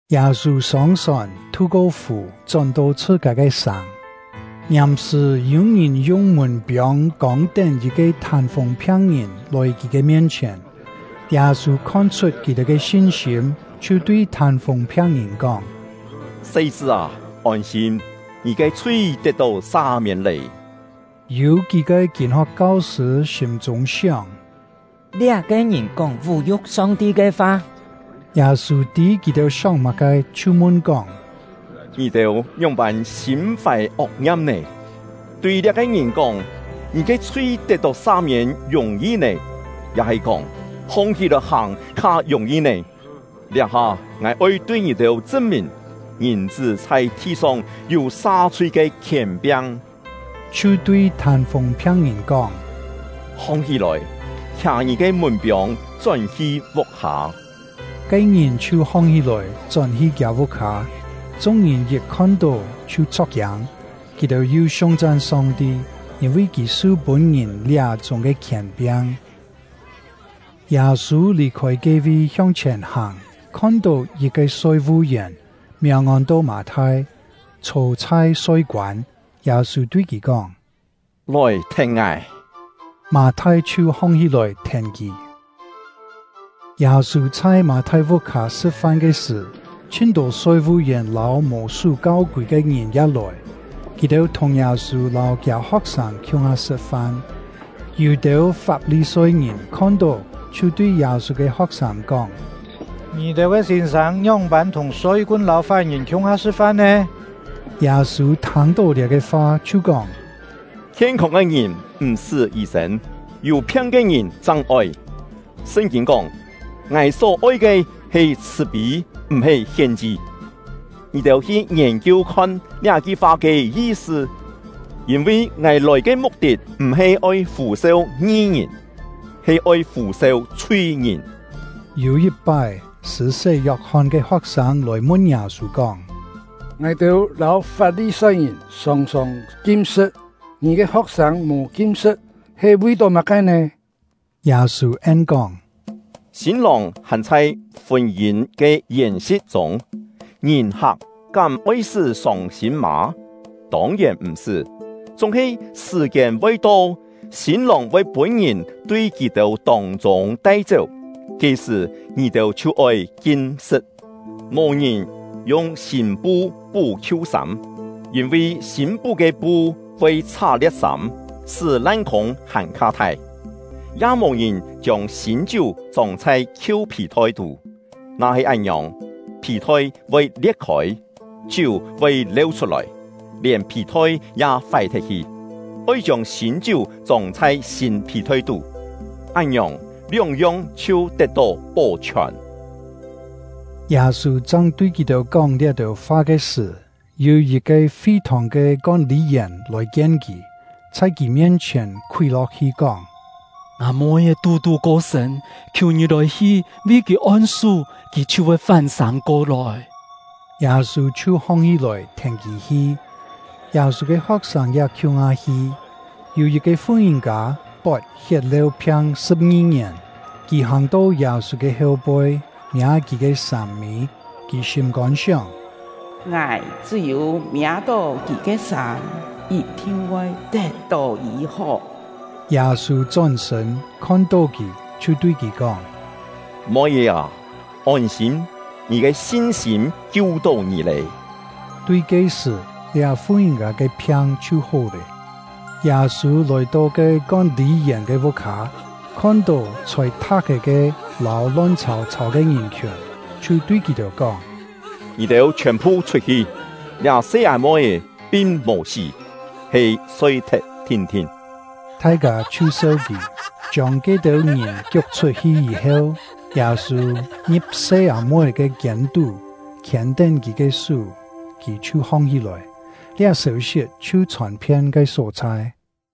Yâ-sû sông-sòn, thu-ko fù, chón-to chhṳ-kâ ke sàng. Ngiàm-sṳ̀ yû-ngìn yung mùn-piông kông-tén yit-ke thân-fûng phiang-ngìn lòi kì ke mien-chhièn. Yâ-sû khon-chhut kì-têu ke sin-sîm, chhiu tui thân-fûng phiang-ngìn kóng: “Se-chṳ́ â, ôn-sîm, ngì ke chhui tet-tó sa-miên lé!” Yû kí-ke kîn-ho̍k kau-sṳ̂ sîm-chûng sióng: “Liá-ke ngìn kóng vú-yu̍k Song-ti ke fa!” Yâ-sû tî kì-têu sióng má-ke, chhiu mun kóng: “Ngì-têu ngióng-pân sîm-fài ok-ngiam nè? Tui liá-ke ngìn kóng: ‘Ngì ke chhui tet-tó sa-miên’ yùng-yi nè? Ya-he kóng: ‘Hong-hí-lòi hàng’ kha yùng-yi nè? Liá-ha ngài oi tui ngì-têu chṳn-mìn, Ngìn-chṳ́ chhai thi-song yû sa-chhui ke khièn-piang.” Chhiu tui thân-fûng phiang-ngìn kóng: “Hong-hí-lòi, khià ngì ke mùn-piông chón-hi vuk-hâ!” Ke-ngìn chhiu hong-hí-lòi, chón-hi kiâ vuk-hâ. Chung-ngìn yit khon-tó chhiu chho̍k-kiâng; kì-têu yu siung-chan Song-ti, yîn-vi Kì su pûn ngìn liá-chúng ke khièn-piang. Yâ-sû lì-khôi ke-vi hiong-chhièn hàng, khon-tó yit-ke soi-vu-yèn, miàng ôn-to Mâ-thai, chhô chhai soi-koân. Yâ-sû tui kì kóng: “Lòi thèn ngài!” Mâ-thai chhiu hong-hí-lòi thèn kì. Yâ-sû chhai Mâ-thai vuk-hâ sṳ̍t-fan ke sṳ̀, chhin-tô soi-vu-yèn lâu mò sú kau-kûi ke ngìn ya lòi; kì-têu thùng Yâ-sû lâu kiâ ho̍k-sâng khiung-ha sṳ̍t-fan. Yû-têu Fap-li-soi-ngìn khon-tó, chhiu tui Yâ-sû ke ho̍k-sâng kóng: “Ngì-têu ke sîn-sâng ngióng-pân thùng soi-kun lâu fái-ngìn khiung-ha sṳ̍t-fan nè?” Yâ-sû thâng-tó liá-ke fa, chhiu kóng: “Khien-không ke ngìn m̀-sṳ́ yî-sên, yû phiang ke ngìn chang oi. Sṳn-kîn kóng: ‘Ngài só oi ke he chhṳ̀-pî, m̀-he hien-chi.’ Ngì-têu hi ngiên-kiu khon liá-ki fa ke yi-sṳ! Yîn-vi ngài lòi ke muk-tit m̀-he oi fû-seu ngi-ngìn, he oi fû-seu chhui-ngìn.” Yû yit-pái, Sṳ̂-sé Yok-hon ke ho̍k-sâng lòi mun Yâ-sû kóng: “Ngài-têu lâu Fap-li-soi-ngìn sòng-sòng kim-sṳ̍t, ngì ke ho̍k-sâng mò kim-sṳ̍t, he vi-tó má-ke nè?” Yâ-sû en-kóng: “Sîn-lòng hàn chhai fûn-yîn ke yèn-si̍t chûng, ngìn-hak kám oi-sṳ́ sông-sîm mâ? Tông-yèn m̀-sṳ́. Chúng-he sṳ̀-kiên voi to, sîn-lòng voi pûn-ngìn tui kì-têu tông-chûng tai-chéu, ke-sṳ̀ kì-têu chhiu oi kim-sṳ̍t. “Mò ngìn yung sîn-pu pú khiu-sâm, yîn-vi sîn pú ke pu voi chhá-lie̍t sâm, sṳ́ lan-khûng hàn-kha thai. Ya mò ngìn chiông sîn-chiú chông chhai khiu phì-thoi tú; na-he án-ngiòng, phì-thoi voi lie̍t-khôi, chiú voi leu chhut-lòi, lièn phì-thoi ya fái-thet hi. Oi chiông sîn-chiú chông chhai sîn phì-thoi tú; án-ngiòng, lióng-yong chhiu tet-tó pó-chhiòn.” Yâ-sû chang tui kì-têu kóng liá-têu fa ke sṳ̀, yû yit-ke fi-thòng ke kón-lî-yèn lòi-kien kì, chhai kì mien-chhièn khúi lo̍k-hi, kóng: “Ngâ moi-é tú-tú ko-sṳ̂n, khiù ngì lòi-hi vi kì on-sú, kì chhiu voi fán-sâng ko-lòi.” Yâ-sû chhiu hong-hí-lòi, thèn kì hi; Yâ-sû ke ho̍k-sâng ya khiung-ha hi. Yû yit-ke fu-ngìn-kâ, pot hiet-leu-phiang sṳ̍p-ngi ngièn; kì hàng-to Yâ-sû ke heu-poi, miâ kì ke sâm-mî. Kì sîm-kôn sióng: “Ngài chṳ́-yû miâ-tó kì ke sâm, yit-thin voi tet-tó yî-hó.” Yâ-sû chón-sṳ̂n, khon-tó kì, chhiu tui kì kóng: “Moi-é â, ôn-sîm, ngì ke sin-sîm kiu-tó ngì lé!” Tui ke-sṳ̀, liá fu-ngìn-kâ ke phiang chhiu hó lé. Yâ-sû lòi-to ke kón-lî-yèn ke vuk-hâ, khon-tó chhôi tha̍k-é ke lâu lon chhàu-chhàu ke ngìn-khiùn, chhiu tui kì-têu kóng: “Ngì-têu chhiòn-phu chhut-hi, liá se-â-moi-é pin mò sí, he soi-thet thin-thin!” Thai-kâ chhiu seu kì. Chiông ke-têu ngìn kiuk chhut-hi yî-heu, Yâ-sû ngi̍p se-â-moi-é ke kiên-tú, khiên-tén kì ke sú, kì chhiu hong-hí-lòi. Liá sêu-sit chhiu chhòn-phien ke só-chhai.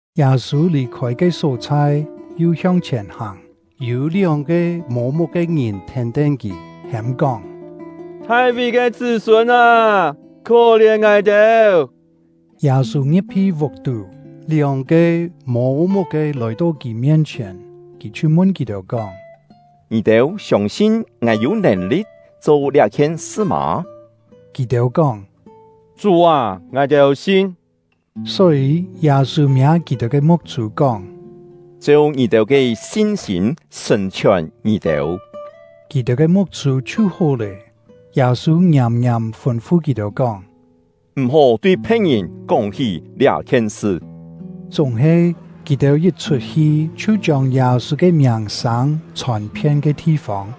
Yâ-sû lì-khôi ke só-chhai, yu hiong-chhièn hàng. Yû lióng-ke mô-muk ke ngìn thèn-tén kì, hêm-kóng: “Thai-ví ke chṳ́-sûn â, khó-lièn ngài-têu!” Yâ-sû ngi̍p-hi vuk-tú, lióng-ke mô-muk-ke lòi-to kì mien-chhièn, kì chhiu mun kì-têu kóng: “Ngì-têu siông-sin ngài yû nèn-li̍t cho liá-khien sṳ mâ?” Kì-têu kóng: “Chú â, ngài-têu sin.” Só-yî, Yâ-sû miâ kì-têu ke muk-chû, kóng: “Cheu ngì-têu ke sin-sîm sṳ̀n-chhiòn ngì-têu!” Kì-têu ke muk-chû chhiu hó lé. Yâ-sû ngiàm-ngiàm fûn-fu kì-têu kóng: “M̀-hó tui phe̍t-ngìn kóng-hí liá-khien sṳ!” Chúng-he, kì-têu yit chhut-hi, chhiu chiông Yâ-sû ke miàng-sâng chhòn-phien ke thi-fông.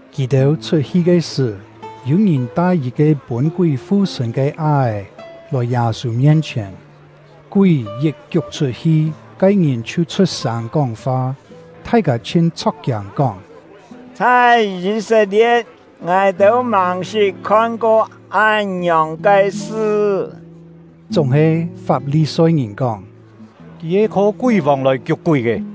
Kì-têu chhut-hi ke sṳ̀, yû-ngìn tai yit-ke pûn-kúi fu-sṳ̂n ke á-è lòi Yâ-sû mien-chhièn. Kúi yit kiuk chhut-hi, ke-ngìn chhiu chhut-sâng kóng-fa. Thai-kâ chhin chho̍k-kiâng, kóng: “Chhai Yî-set-lie̍t, ngài-têu màng-sṳt khon-ko án-ngiòng ke sṳ.” Chúng-he, Fap-li-soi-ngìn kóng: “Kì he kho kúi-vòng lòi kiuk-kúi ke.”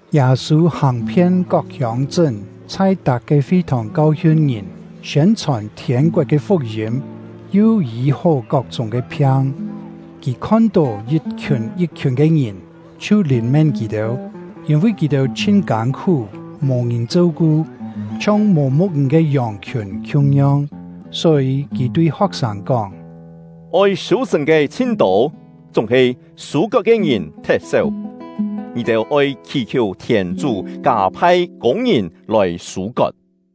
Yâ-sû hàng-phien kok hiông-chṳ́n, chhai tak-ke fi-thòng kau-hiun ngìn, siên-chhòn thiên-koet ke fuk-yîm, yu yî-hó kok-chúng ke phiang. Kì khon-tó yit-khiùn yit-khiùn ke ngìn, chhiu lìn-mén kì-têu, yîn-vi kì-têu chhin kân-khú, mò-ngìn cheu-ku, chhiong mò mu̍k-ngìn ke yòng-khiùn khiung-yong. Só-yî, kì tui ho̍k-sâng kóng: “Oi sû-sṳ̀n ke chhin-tô, chúng-he sû-kot ke ngìn thet-séu. Ngì-têu oi khì-khiù thièn-chú kâ-phai kûng-ngìn lòi sû-kot.”